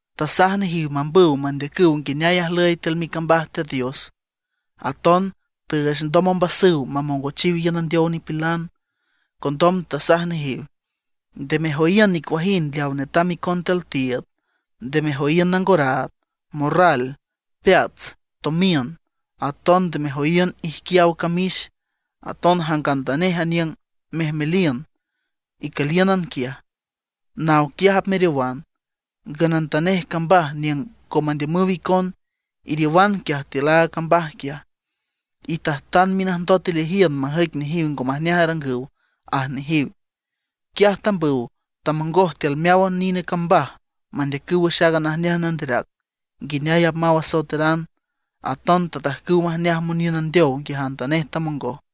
Tasaj nejiw mambüw mandeacüw nguineay ajlüy tiül micambaj Teat Dios; aton tüüch ndom ombasüw mamongochiw iün andeow nipilan. Condom tasaj nejiw: ―Nde mejoyiün nicuajind leaw netam icon tiül tiiüd, nde mejoyiün nangoraad, morral, peats, tomiün. Aton nde mejoyiün ijquiaw camix. Aton jangantanej aniüng mejmeliün icülíünan quiaj, naw quiaj apmeriowan. Ngünantanej cambaj niüng ngo mandiümüw icon, iriowan quiaj tiül aaga cambaj quiaj. Itajtan minajndot ileajiün majüic nejiw ngo majneaj arangüw ―aj nejiw. Quiaj tambüw tamongoj tiül meáwan nine cambaj mandeacüw wüx aaga najneaj nanderac, nguineay apmaw asoeteran; aton tajtajcüw majneaj moniün andeow nguiajantanej tamongoj.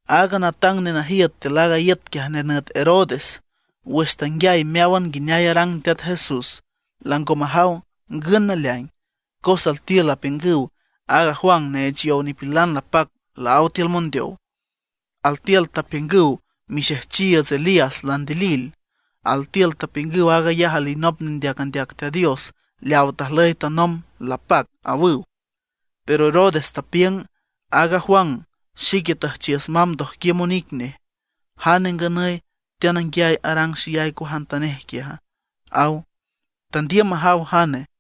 Aaga natang nenajiüt tiül aaga iüt quiaj nenüt Herodes, wüx tanguiay meáwan nguineay arang Teat Jesús, lango majaw ngün naleaing, cos altiül apiüngüw aaga Juan neech yow nipilan lapac laáw tiül mondeow. Altiül tapiüngüw mixejchiiüts Elías landilil. Altiül tapiüngüw aag ayaj alinop nendeac andeac Teat Dios leawa tajlüy tanomb lapac, awüw. Pero Herodes tapiüng: ―Aaga Juan xique tüjchiüs mamb ndojquiüm onic nej. ¿Jane nganüy teananguiay arang xeyay cuajantanej quiaja? ―aw. Tandiüm majaw jane.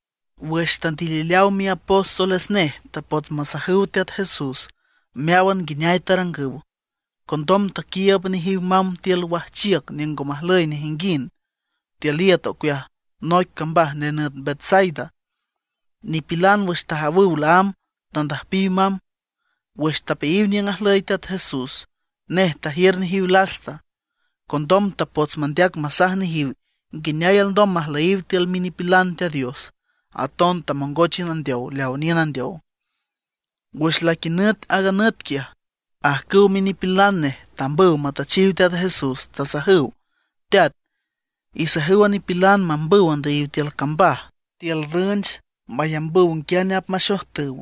Wüx tandilileaw miapóstoles nej tapots masajüw Teat Jesús meáwan nguineay tarangüw. Condom taquiiüb nejiw mamb tiül wajchiüc niüng ngo majlüy nejinguind, tiül iüt ocueaj noic cambaj nenüt Betsaida. Nipilan wüx tajawüw laámb tandüjpiw mamb. Wüx tapeayiw niüng ajlüy Teat Jesús nej tajiür nejiw lasta. Condom tapots mandeac masaj nejiw nguineay alndom majlüyiw tiül minipilan Teat Dios. Aton tamongoch iün andeow leaw niün andeow. Wüx laquinüt aaga nüt quiaj, ajcüw minipilan nej tambüw matüchiw Teat Jesús, tasajüw: ―Teat, isajüw a nipilan mambüw andüyiw tiül cambaj, tiül rünch mayambüw nguiane apmaxojtüw,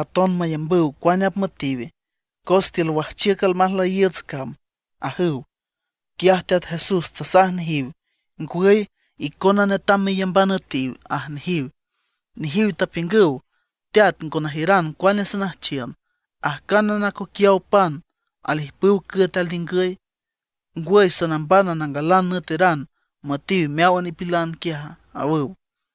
aton mayambüw cuane apmüetiw, cos tiül wajchiüc almajlüyiiüts cam ―ajüw. Quiaj Teat Jesús tasaj nejiw: ―Ngwüy, icona netam meyamban üetiw ―aj nejiw. Nejiw tapiüngüw: ―Teat, ngo najiüran cuane sanüjchiün, ajcánan acoquiaw pan alijpüw cüet alningüy. ¿Ngwüy sanambana nangalan nüeteran müetiw meáwan nipilan quiaja? ―awüw.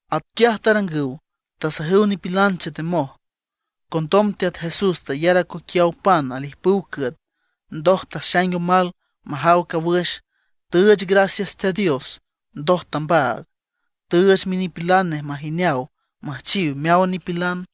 Atquiaj tarangüw, tasajüw nipilan chetemoj. Condom Teat Jesús tayar acoquiaw pan alijpüw cüet. Ndoj taxaing omal majaw cawüx, tüüch gracias Teat Dios, ndoj tambaag, tüüch minipilan nej majineaw müjchiw meáwan nipilan.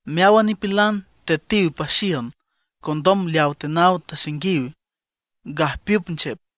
Meáwan nipilan tetiw paxiün, condom leaw tenaw taxainguiw gajpiüp nchep.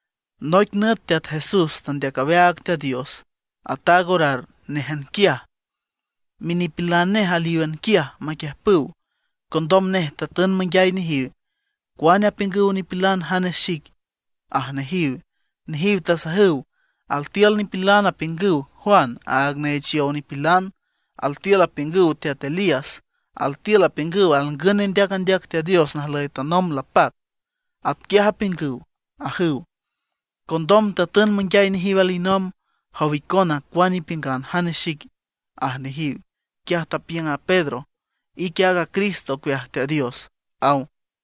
Noic nüt Teat Jesús teandeac aweaag Teat Dios, ataag orar néjan quiaj; minipilan nej alíwan quiaj maquiüjpüw. Condom nej tatün manguiay nejiw: ―¿Cuane apiüngüw nipilan jane xic? ―aj nejiw. Nejiw tasajüw: ―Altiül nipilan apiüngüw Juan, aaga neech yow nipilan. Altiül apiüngüw Teat Elías; altiül apiüngüw alngün nendeac andeac Teat Dios najlüy tanomb lapac. Atquiaj apiüngüw ―ajüw. Condom tatün manguiay nejiw alinomb: ―¿Jow icona, cuane ipiüngan jane xic? ―aj nejiw. Quiaj tapiüng a Pedro: ―Ique aaga Cristo ocueaj Teat Dios ―aw.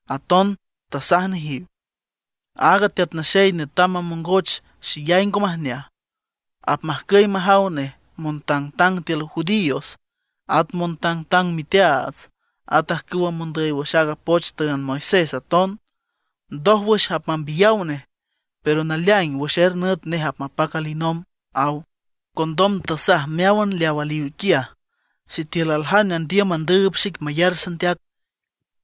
At aton tasaj nejiw: ―Aaga Teat Naxey netam mamongoch xeyay ngo majneaj. Apmajcüy majaw nej montangtang tiül judíos, at montangtang miteaats, at ajcüw mondüy wüx aaga poch tüünd Moisés aton. Ndójwüx apmambiyaw nej. Pero naleaing wüx er nüt nej apmapac alinomb ―aw. Condom tasaj meáwan leaw aliw quiaj: ―Sitiül aljane andiüm mandüüb xic mayar sandeac,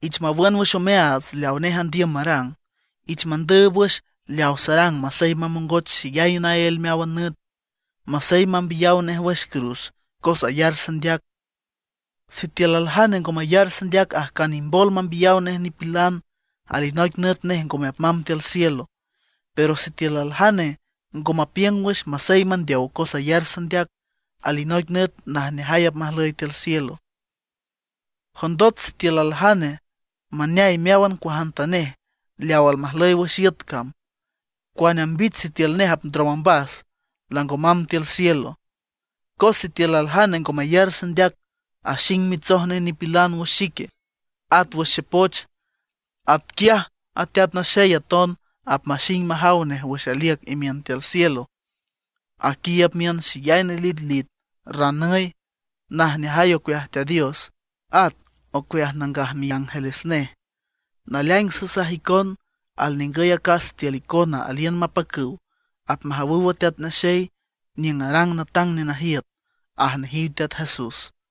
ich mawün wüx omeaats leawa nej andiüm marang. Ich mandüüb wüx leaw sarang masey mamongoch xeyay naél meáwan nüt; masey mambiyaw nej wüx cruz cos ayar sandeac. Sitiül aljane ngo mayar sandeac ajcan imbol mambiyaw nej nipilan, alinoic nüt nej ngome apmamb tiül cielo. Pero sitiül aljane ngo mapiüng wüx masey mandeow cos ayar sandeac, alinoic nüt najneajay apmajlüy tiül cielo. ¿Jondot sitiül aljane maneay meáwan cuajantanej leaw almajlüy wüx iüt cam, cuane ambich sitiül nej apndrom ombas, lango mamb tiül cielo? Cos sitiül aljane ngo mayar sandeac, axing mitsoj nej nipilan wüx xique, at wüx xepoch; atquiaj a Teat Naxey aton apmaxing majaw nej wüx aliüc imiün tiül cielo, aquiiüb miün xeyay nelitlit, ranüy, najneajay ocueaj Teat Dios, at ocueaj nangaj miángeles nej. Naleaing sasaj icon alningüy acas tiül icona aliün mapacüw apmajawüw a Teat Naxey niüng arang natang nenajiüt ―aj nejiw Teat Jesús.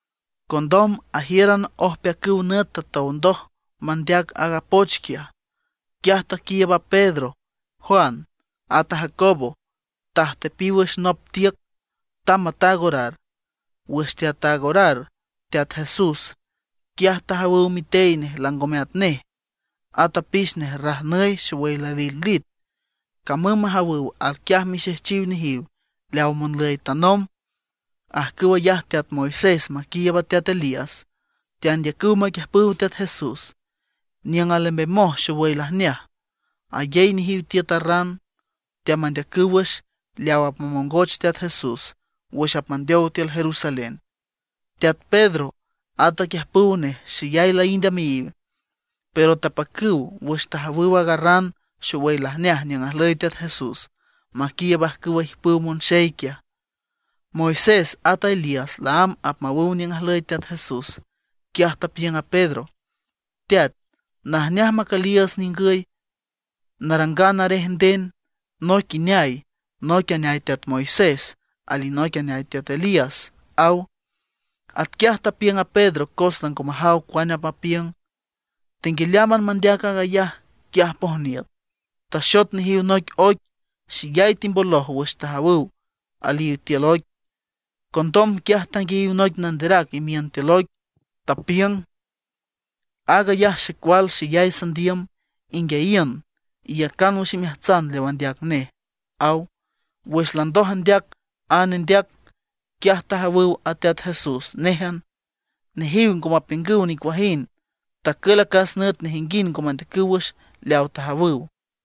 Condom ajíüran ojpeacüw nüt tatow ndoj mandeac aaga poch quiaj, quiaj taquiiüb a Pedro, Juan, at a Jacobo, tajtepiw wüx nop tiüc, tamb mataag orar. Wüx teataag orar Teat Jesús, quiaj tajawüw mitey nej langome atnej, at apix nej rajnüy, xowüy lalitlit. Camüm majawüw, alquiaj mixejchiw nejiw leaw monlüy tanomb, ajcüw ayaj teat Moisés maquiiüb a teat Elías, teandeacüw maquiüjpüw Teat Jesús. Niüng alembemoj xowüy lajneaj, ayey nejiw tiüt a ran. Teamandeacüw wüx leaw apmamongoch Teat Jesús wüx apmandeow tiül Jerusalén. Teat Pedro, at aquiüjpüw nej xeyay laínd ameayiw, pero tapacüw wüx tajawüw aaga ran xowüy lajneaj niüng ajlüy Teat Jesús maquiiüb ajcüwa ijpüw monxey quiaj. Moisés ata Elías laámb apmawüw niüng ajlüy Teat Jesús, quiaj tapiüng a Pedro: ―Teat, najneaj macüliiüts ningüy narangan arej nden, noic ineay, noic aneay teat Moisés, alinoic aneay teat Elías ―aw. Atquiaj tapiüng a Pedro cos lango majaw cuane apmapiüng. Tenguialeámban mandeac aag ayaj, quiaj pojniüt, taxot nejiw noic oic. Xeyay timboloj wüx tajawüw aliw tiül oic. Condom quiaj tanguiayiw noic nanderac imiün tiül oic, tapiüng: ―Aag ayaj xecual xeyay sandiüm; inguiayiün, iyacan wüx imeajtsan leaw andeac nej ―aw. Wüx landoj andeac a nendeac, quiaj tajawüw a Teat Jesús néjan. Nejiw ngo mapiüngüw nicuajind. Tacül acas nüt nejinguind ngo mandeacüw wüx leaw tajawüw.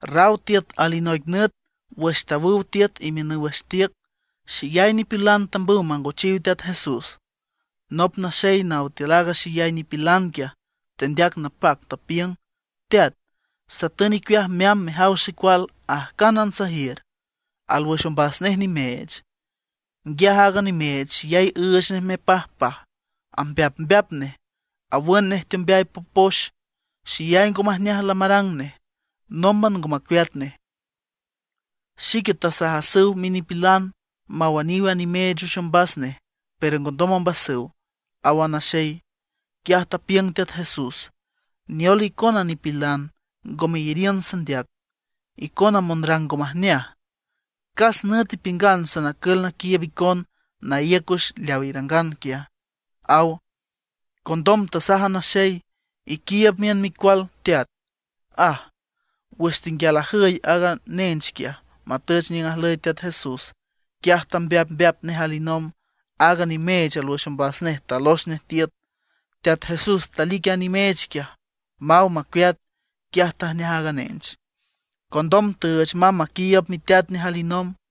Raw tiüt alinoic nüt wüx tawüw tiüt imiünüw wüx tiüc, xeyay nipilan tambüw mangochiw Teat Jesús. Nop naxey naw tiül aaga xeyay nipilan quiaj tendeac napac, tapiüng: ―Teat, satün icueaj meamb mejaw xecual ajcánan sajiür. Alwüx ombas nej nimeech. Nguiaj aaga nimeech xeyay üüch nej mepajpaj, ambeapmbeap nej, awün nej teombeay popox. Xeyay ngo majneaj lamarang nej, nómban ngo macueat nej. Xique tasajasüw minipilan mawüniw a nimeech wüx ombas nej, pero ngondom ombasüw ―aw a naxey. Quiaj tapiüng Teat Jesús: ―¡Neol icona nipilan ngo meyariün sandeac, icona monrang ngo majneaj! ¿Cas nüt ipiüngan sanacül naquiiüb icon, naíüc wüx leaw irangan quiaj? ―aw. Condom tasaj a naxey: ―Iquiiüb miün micual, teat ―aj. Wüx tenguial ajüy aaga nench quiaj matüch niüng ajlüy Teat Jesús, quiaj tambeapmbeap nej alinomb. Aaga nimeech alwüx ombas nej talox nej tiüt. Teat Jesús talic a nimeech quiaj, maw macueat; quiaj tajneaj aaga nench. Condom tüüch mamb maquiiüb miteat nej alinomb.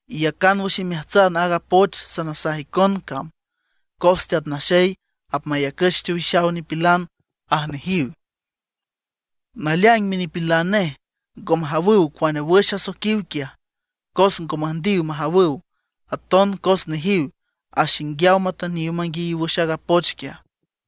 ―Iyacan wüx imeajtsan aaga poch sanasaj icon cam, cos Teat Naxey apmayacüch teowixaw nipilan ―aj nejiw. Naleaing minipilan nej ngo majawüw cuane wüx asoiquiw quiaj, cos ngo müjndiw majawüw, aton cos nejiw axinguiaw matüniw manguiayiw wüx aaga poch quiaj.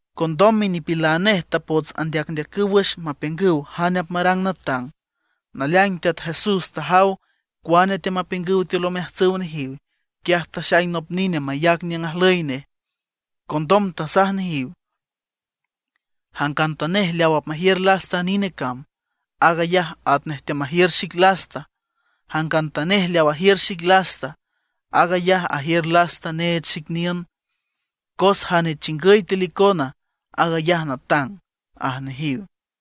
Condom minipilan nej tapots andeacndeacüw wüx mapiüngüw jane apmarang natang. Naleaing Teat Jesús tajaw cuane teamapiüngüw tiül omeajtsüw nejiw. Quiaj taxaing nop nine mayac niüng ajlüy nej. Condom tasaj nejiw: ―Jangantanej leaw apmajiür lasta aaga nine cam, aag ayaj atnej teamajiür xic lasta; jangantanej leaw ajiür xic lasta, aag ayaj ajiür lasta neech xic niün. Cos jane chingüy tiül icona, aag ayaj natang ―aj nejiw.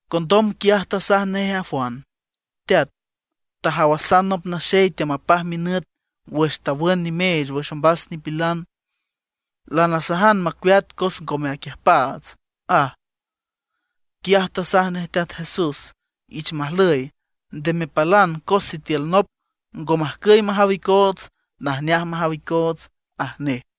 Condom quiaj tasaj nej a Juan: ―Teat, tajawasan nop naxey teamapaj minüt wüx tawün nimeech wüx ombas nipilan, lanasajan macueat cos ngome aquiüjpaats ―aj. Quiaj tasaj nej Teat Jesús: ―Ich majlüy, nde mepalan cos sitiül nop ngo majcüy majaw icoots, najneaj majaw icoots ―aj nej.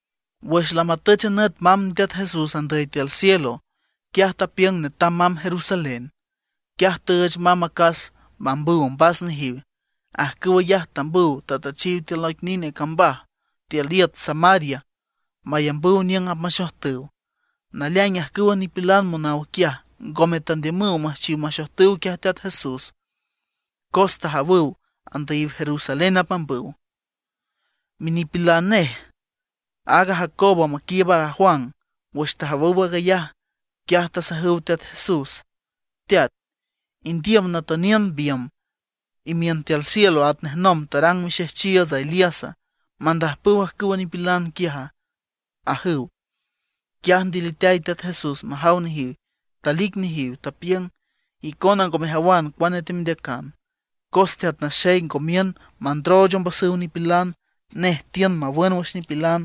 Wüx lamatüch a nüt mamb Teat Jesús andüy tiül cielo, quiaj tapiüng netam mamb Jerusalén. Quiaj tüüch mamb acas mambüw ombas nejiw. Ajcüw ayaj tambüw tatüchiw tiül noic nine cambaj tiül iüt Samaria mayambüw niüng apmaxojtüw. Naleaing ajcüwa nipilan monaw quiaj ngome tandiümüw müjchiw maxojtüw quiaj Teat Jesús cos tajawüw andüyiw Jerusalén apmambüw. Minipilan nej, aaga Jacobo maquiiüb a Juan wüx tajawüw aag ayaj, quiaj tasajüw Teat Jesús: ―Teat, ¿indiüm natüniün biümb imiün tiül cielo atnej nomb tarang mixejchiiüts Elíasa, mandajpüw ajcüwa nipilan quiaja? ―ajüw. Quiaj ndiliteay Teat Jesús majaw nejiw, talic nejiw, tapiüng: ―Icona ngo mejawan cuane teamendeacan. Cos Teat Naxey ngo miün mandrooch ombasüw nipilan, nej tiün mawün wüx nipilan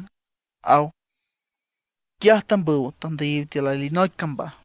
―aw. Quiaj tambüw tandüyiw tiül alinoic cambaj.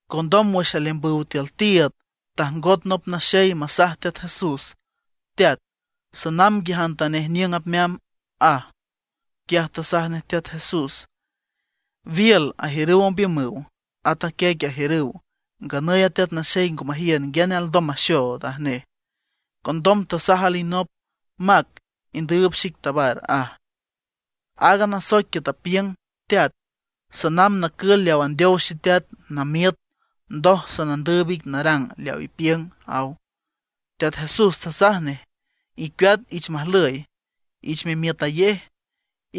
Condom wüx aleambüw tiül tiiüd tajngot nop naxey masaj Teat Jesús: ―Teat, sanamb nguiajantanej niüng apmeamb ―aj. Quiaj tasaj nej Teat Jesús: ―Wiül ajiürüw ombiümüw, at a quiec ajiürüw; nganüy a Teat Naxey ngo majiür nguiane alndom maxood ―aj nej. Condom tasaj alinop: ―Mac, indüüb xic, tabar ―aj. Aaga nasoic quiaj tapiüng: ―Teat, sanamb nacül leaw andeow xeteat, namiüt; ndoj sanandüüb ic narang leaw ipiüng ―aw. Teat Jesús tasaj nej: ―Icueat, ich majlüy ich memiütayej.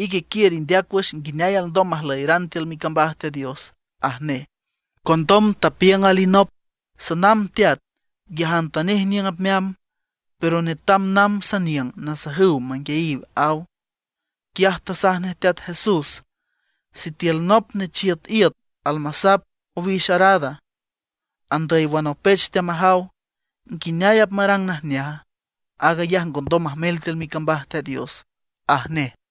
Ique quiür indeac wüx nguineay alndom majlüyeran tiül micambaj Teat Dios ―aj nej. Condom tapiüng alinop: ―Sanamb teat, nguiajantanej niüng apmeamb, pero netam namb saniüng nasajüw manguiayiw ―aw. Quiaj tasaj nej Teat Jesús: ―¿Sitiül nop nechiüt iüt almasap owix arada, andüy wanopech teamajaw, nguineay apmarang najneaja? Aag ayaj ngondom majmel tiül micambaj Teat Dios ―aj nej.